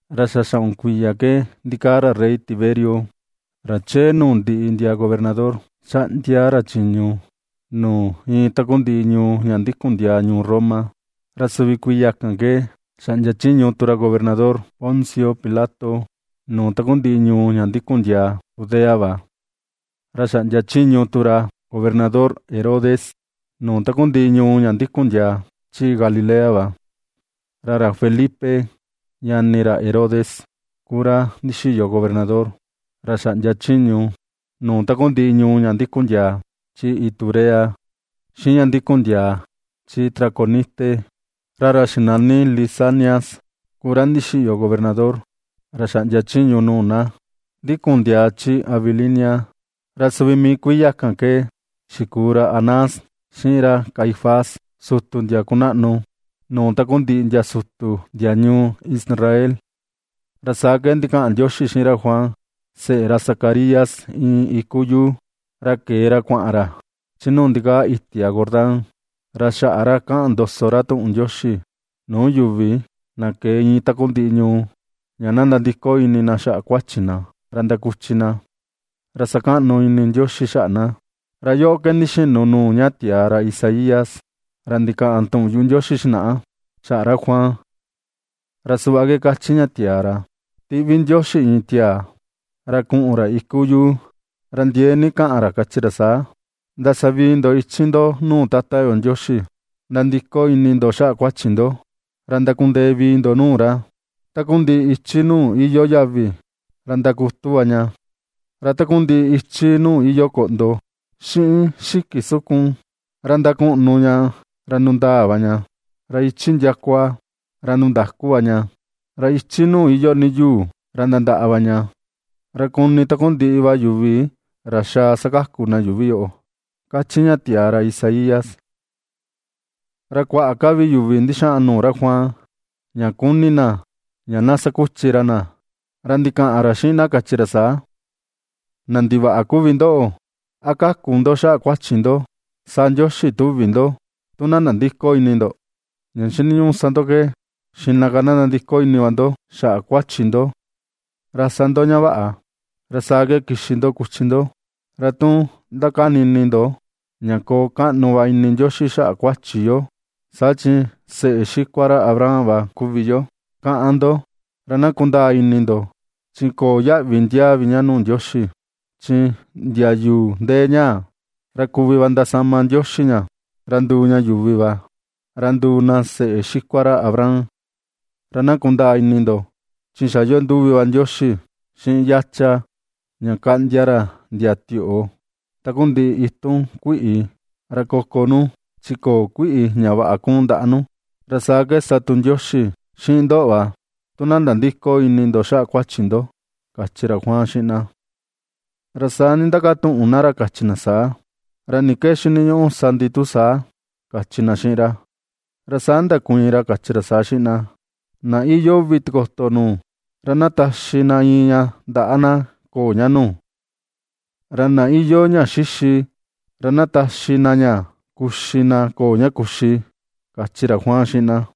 Ra xa xaꞌun kuiya ke ndikaa ra rey Tiberio, ra chee nuu ndiꞌi ndia gobernador, xaꞌndia ra chiñu nuu iin takundiꞌi ñuu ña ndikun ndiaa ñuu Roma. Ra suvi kuiya kan ke xaꞌndia chiñu tu ra gobernador Poncio Pilato nuu takundiꞌi ñuu ña ndikun ndiaa Judea va; ra xaꞌndia chiñu tu ra gobernador Herodes nuu takundiꞌi ñuu ña ndikun ndiaa chi Galilea va, ra ra Felipe, ñani ra Herodes ku ra ndixiyo gobernador ra xaꞌndia chiñu nuu takundiꞌi ñuu ña ndikun ndiaa chi Iturea, xiꞌin ña ndikun ndiaa chi Traconite; ra ra xinani Lisanias ku ra ndixiyo gobernador ra xaꞌndia chiñu nuu na ndikun ndiaa chi Abilinia. Ra suvi mii kuiya kan ke xikuu ra Anás xiꞌin ra Caifás, sutu ndia kunaꞌnu nuu takundiꞌi ndia sutu ndia ñuu Israel, ra saa ke ndikaꞌan Ndioxi xiꞌin ra Juan, seꞌe ra Zacarías, iin iku yuu. Ra ke̱e ra kuaꞌan ra chi nuu ndikaa itia Jordán. Ra xaꞌa ra kaꞌan ndoso ra tuꞌun Ndioxi nuu yuvi na ke̱e iin takundiꞌi ñuu, ña na ndandiko ini na xaꞌa kuachi na, ra ndakuchi na, ra sakaꞌnu ini Ndioxi xaꞌa na. Ra yoꞌo ke ndixinu nuu ña tiaa ra Isaías, ra ndikaꞌan tuꞌun yuꞌu Ndioxi xinaꞌa xaꞌa ra Juan. Ra suꞌva ke kachi ña tiaa ra: Tiꞌvi Ndioxi iin tiaa, ra kuꞌun ra iku yuu, ra ndiee ni kaꞌan ra, kachi ra saa: “Ndasavii ndo ichi ndo nuu Tata yo Ndioxi. Ndandiko ini ndo xaꞌa kuachi ndo, ra ndakundee vii ndo nuu ra. Takundiꞌi ichi nuu iyoo yavi ra ndakutu va ña, Ra takundiꞌi ichi nuu iyoo koꞌndo xiꞌin xiki sukun, ra ndakuꞌnu ña ra ndundaa va ña. Ra ichi ndiakua, ra ndundaku va ña. Ra ichi nuu iyoo ni yuu, ra ndandaꞌa va ña. Ra kuni takundiꞌi va yuvi ra xaa sakaku na yuuvi yoꞌo”, ^kachi ña tiaa ra Isaías. Ra kuaꞌa ka vi yuvi ndixaa nuu ra Juan ña kuni na, ña na sakuchi ra na. Ra ndikaꞌan ra xiꞌin na, kachi ra saa: ―¡Na ndivaꞌa kuvi ndoꞌo! ¿A kaku ndo xaꞌa kuachi ndo sa Ndioxi tuvi ndo tu na nandïko ini ndo? Ña xiniñuꞌu sa ndo ke xiꞌna ka na nandiko ini va ndo xaꞌa kuachi ndo, ra sa ndo ña vaꞌa. Ra saa ke kixi ndo kuchi ndo. Ra tu ndakani ini ndo ña: “Koo kaꞌnu va ini Ndioxi xaꞌa kuachi yo, saa chi seꞌe xikua ra Abraham va kuvi yo”, kaꞌan ndo, ra na kundaa ini ndo, chi köo yaꞌvi ndiaa vi ña nuu Ndioxi. Chi ndia yuu ndee ñaa ra kuvi ndasama Ndioxi ña ra nduu ña yuvi va, ra nduu na seꞌe xikua ra Abraham. Ra na kundaa ini ndo chi xa iyoo nduvi va Ndioxi xiꞌin yacha ña kaꞌndia ra ndia tioꞌo takundiꞌi itun kuiꞌi ra koko nu chi köo kuiꞌi ña vaꞌa kuun ndaꞌa nu. Ra saa ke sa tu Ndioxi xiꞌin ndoꞌo va tu na nandïko ini ndo xaꞌa kuachi ndo ―kachi ra Juan xiꞌin na. Ra saa ndindakatuꞌun na ra kachi na saa: ―¿Ra ni ke xiniñuꞌu sa ndi, tu saa? ―kachi na xiꞌin ra. Ra saa ndakuiin ra, kachi ra saa xiꞌin na: ―Na iyoo uvi tikoto nuu, ra na taxi na iin ña ndaꞌa na köo ña nuu; ra na iyoo ña xixi, ra na taxi na ña kuxi na köo ña kuxi ―kachi ra Juan xiꞌin na.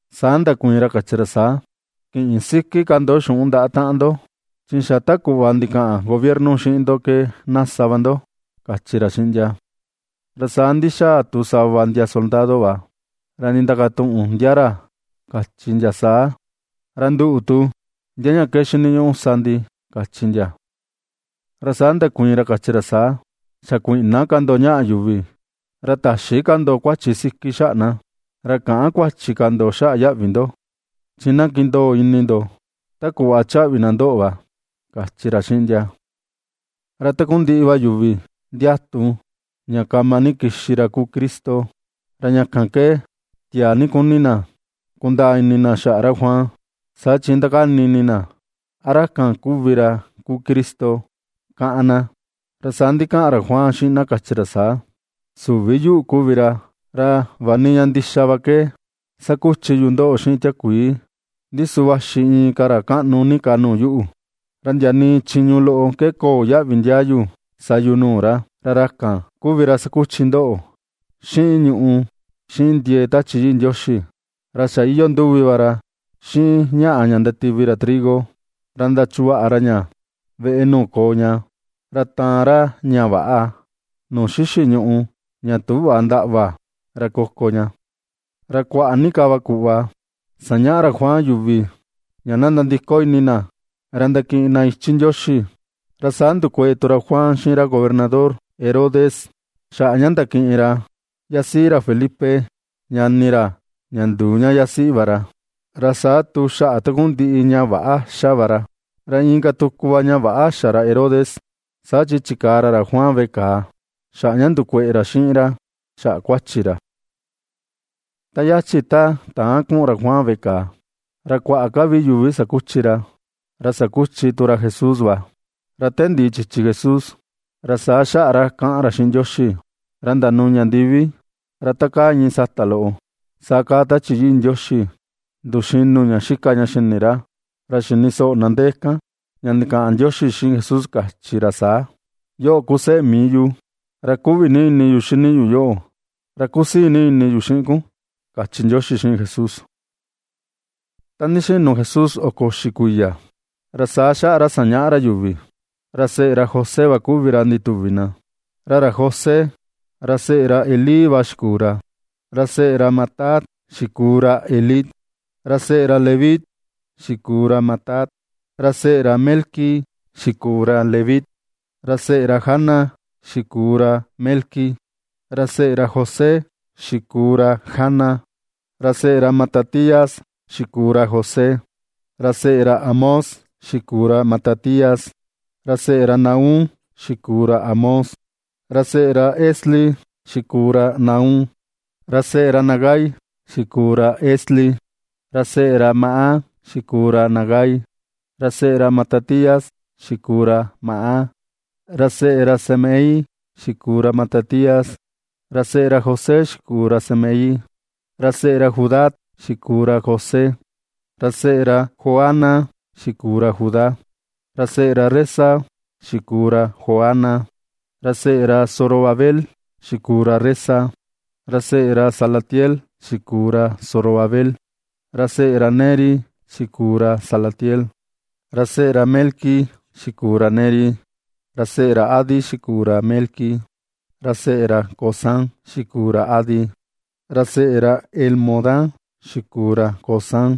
Saa ndakuiin ra, kachi ra saa: ―Kïꞌin siki ka ndo xuꞌun ndaꞌa taꞌan ndo; chi xa ta kuꞌva ndikaꞌan gobierno xiꞌin ndo ke na sa va ndo ―kachi ra xiꞌin ndia. Ra saa ndixaa tu sava ndia soldado va ra ndindakatuꞌun ndia ra, kachi ndia saa: ―Ra nduꞌu tu, ¿ndia ña ke xiniñuꞌu sa ndi? ―kachi ndia. Ra saa ndakuiin ra, kachi ra saa: ―Xa kuïꞌna ka ndo ñaꞌa yuvi, ra täxi ka ndo kuachi siki xaꞌa na. Ra käꞌan kuachi ka ndo xaꞌa yaꞌvi ndo, chi na kindoo ini ndo ta kuꞌva chaꞌvi na ndoꞌo va ―kachi ra xiꞌin ndia. Ra takundiꞌi va yuvi ndiatu ña kama ni kixi ra kuu Cristo, ra ña kan ke tiaa ni kuni na kundaa ini xaꞌa ra Juan, saa chi ndakani ini na a ra kan kuvi ra kuu Cristo kaꞌan na. Ra saa ndikaꞌan ra Juan xiꞌin na, kachi ra saa: ―Süvi yuꞌu kuvi ra. Ra vaꞌa ni ña ndixa va ke ^sakuchi yu ndoꞌo xiꞌin tiakuii, ndi su vaxi inka ra kaꞌnu ni ka nuu yuꞌu, ra ndia nii chiñu loꞌo ke köo yaꞌvi ndiaa yu sa yu nuu ra. Ra ra kan kuvi ra sakuchi ndoꞌo xiꞌin ñuꞌu xiꞌin ndie̱e̱ Tachi Yii Ndioxi. Ra xa iyoo nduvi va ra xiꞌin ñaꞌa ña ndativi ra trigo ra ndachuvaꞌa ra ña veꞌe nuu koo ña, ra taan ra ña väꞌa nuu xixi ñùꞌù ña tüꞌva ndaꞌva ra koko ña. Ra kuaꞌa ni ka va kuꞌva sañaꞌa ra Juan yuvi, ña na nandiko ini na ra ndakiꞌin na ichi Ndioxi. Ra saa ndukeꞌe tu ra Juan xiꞌin ra gobernador, Herodes, xaꞌa ña ndakiꞌin ra yasiꞌi ra Felipe, ñani ra, ña nduu ña yasiꞌi va ra, ra saa tu xaꞌa takundiꞌi ña väꞌa xa va ra. Ra inka tuku va ña väꞌa xa ra Herodes, saa chi chikaa ra ra Juan veꞌe kàà xaꞌa ña ndukueꞌe ra xiꞌin ra xaꞌa kuachi ra. Ta yachi ta täan kuꞌun ra Juan veꞌe kàà, ra kuaꞌa ka vi yuvi sakuchi ra, ra sakuchi tu ra Jesús va, ra te ndiꞌi chichi Jesús, ra saa xaꞌa ra kaꞌan ra xiꞌin Ndioxi, ra ndanuña ndivi. Ra ta kaa iin sata loꞌo, saa kaa Tachi Yii Ndioxi nduxinu ña xika ña xini ra. Ra xini soꞌo na ndee kan ña ndikaꞌan Ndioxi xiꞌin Jesús, kachi ra saa: ―Yoꞌo ku seꞌe mii yu ra kuꞌvi ni ini yu xini yu yoꞌo, ra kusii ni ini yu xiꞌin kun ―kachi Ndioxi xiꞌin Jesús. Ta ndixinu Jesús oko uxi kuiya ra saa xaꞌa ra sañaꞌa ra yuvi. Ra seꞌe ra José va kuvi ra ndituvi na. Ra ra José ra seꞌe ra Elí va xikuu ra. Ra seꞌe ra Matat xikuu ra Elí. Ra seꞌe ra Leví xikuu ra Matat. Ra seꞌe ra Melqui xikuu ra Leví. Ra seꞌe ra Jana xikuu ra Melqui. Ra seꞌe ra José xikuu ra Jana. Ra seꞌe ra Matatías xikuu ra José. Ra seꞌe ra Amós xikuu ra Matatías. Ra seꞌe ra Nahum xikuu ra Amós. Ra seꞌe ra Esli xikuu ra Nahum. Ra seꞌe ra Nagai xikuu ra Esli. Ra seꞌe ra Maat xikuu ra Nagai. Ra seꞌe ra Matatías xikuu ra Maat. Ra seꞌe ra Semei xikuu ra Matatías. Ra seꞌe ra José xikuu ra Semei. Ra seꞌe ra Judá xikuu ra José. Ra seꞌe ra Joana xikuu ra Judá. Ra seꞌe ra Resa xikuu ra Joana. Ra seꞌe ra Zorobabel xikuu ra Resa. Ra seꞌe ra Salatiel xikuu ra Zorobabel. Ra seꞌe ra Neri xikuu ra Salatiel. Ra seꞌe ra Melqui xikuu ra Neri. Ra seꞌe ra Adi xikuu ra Melqui. Ra seꞌe ra Cosam xikuu ra Adi. Ra seꞌe ra Elmodan xikuu ra Cosam.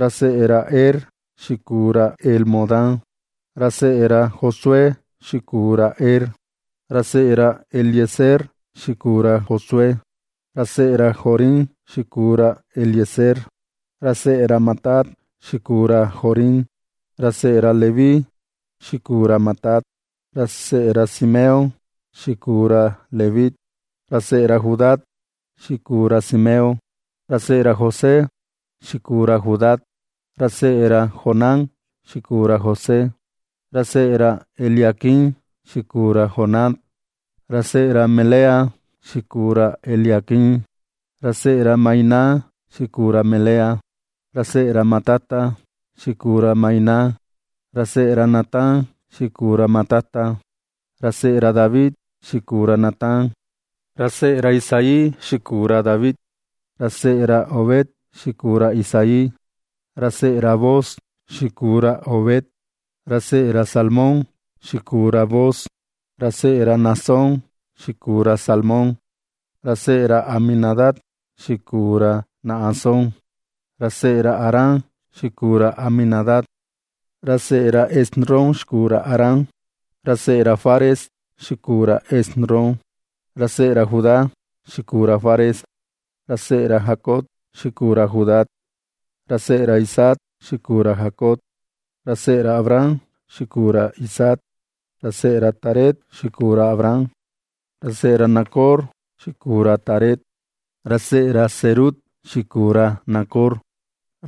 Ra seꞌe ra Er xikuu ra Elmodan. Ra seꞌe ra Josué xikuu ra Er. Ra seꞌe ra Eliezer xikuu ra Josué Ra seꞌe ra Jorim xikuu ra Eliezer. Ra seꞌe ra Matat xikuu ra Jorim. Ra seꞌe ra Leví xikuu ra Matat. Ra seꞌe ra Simeón xikuu ra Leví. Ra seꞌe ra Judá xikuu ra Simeón. Ra seꞌe ra José xikuu ra Judá. Ra seꞌe ra Jonán xikuu ra José. Ra seꞌe ra Eliaquim xikuu ra Jonán. Ra seꞌe ra Melea xikuu ra Eliaquim. Ra seꞌe ra Mainán xikuu ra Melea. Ra seꞌe ra Matata xikuu ra Mainán. Ra seꞌe ra Natán xikuu ra Matata. Ra seꞌe ra David xikuu ra Natán. Ra seꞌe ra Isaí xikuu ra David. Ra seꞌe ra Obed xikuu ra Isaí. Ra seꞌe ra Booz xikuu ra Obed. Ra seꞌe ra Salmón xikuu ra Booz. Ra seꞌe ra Naasón xikuu ra Salmón. Ra seꞌe ra Aminadab xikuu ra Naasón. Ra seꞌe ra Aram xikuu ra Aminadab. Ra seꞌe Esrom xikuu ra Aram. Ra seꞌe ra Fares xikuu ra Esrom. Ra seꞌe ra Judá xikuu ra Fares. Ra seꞌe ra Jacob xikuu ra Judá. Ra seꞌe ra Isaac xikuu ra Jacob. Ra seꞌe ra Abraham xikuu ra Isaac. Ra seꞌe ra Taré xikuu ra Abraham. Ra seꞌe ra Nacor xikuu ra Taré. Ra seꞌe ra Serug xikuu ra Nacor.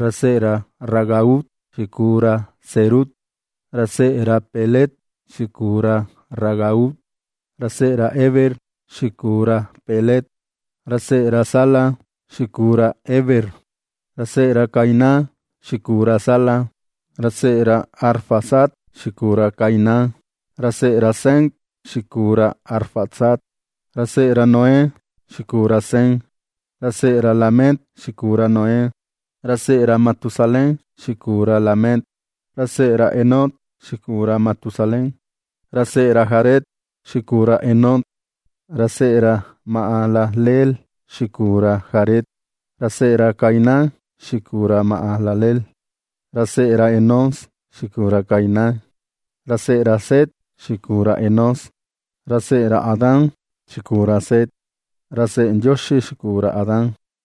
Ra seꞌe ra Ragau xikuu ra Serug. Ra seꞌe ra Peleg xikuu ra Ragau. Ra seꞌe ra Heber xikuu ra Peleg. Ra seꞌe ra Sala xikuu ra Heber. Ra seꞌe ra Cainán xikuu ra Sala. Ra seꞌe ra Arfaxad xikuu ra Cainán. Ra seꞌe ra Sem xikuu ra Arfaxad. Ra seꞌe ra Noé xikuu ra Sem. Ra seꞌe ra Lamec xikuu ra Noé. Ra seꞌe ra Matusalén xikuu ra Lamec. Ra seꞌe ra Enoc xikuu ra Matusalén. Ra seꞌe ra Jared xikuu ra Enoc. Ra seꞌe ra Mahalaleel xikuu ra Jared. Ra seꞌe ra Cainán xikuu ra Mahalaleel. Ra seꞌe ra Enós xikuu ra Cainán. Ra seꞌe ra Set xikuu ra Enós. Ra seꞌe ra Adán xikuu ra Set. Ra seꞌe Ndioxi xikuu ra Adán.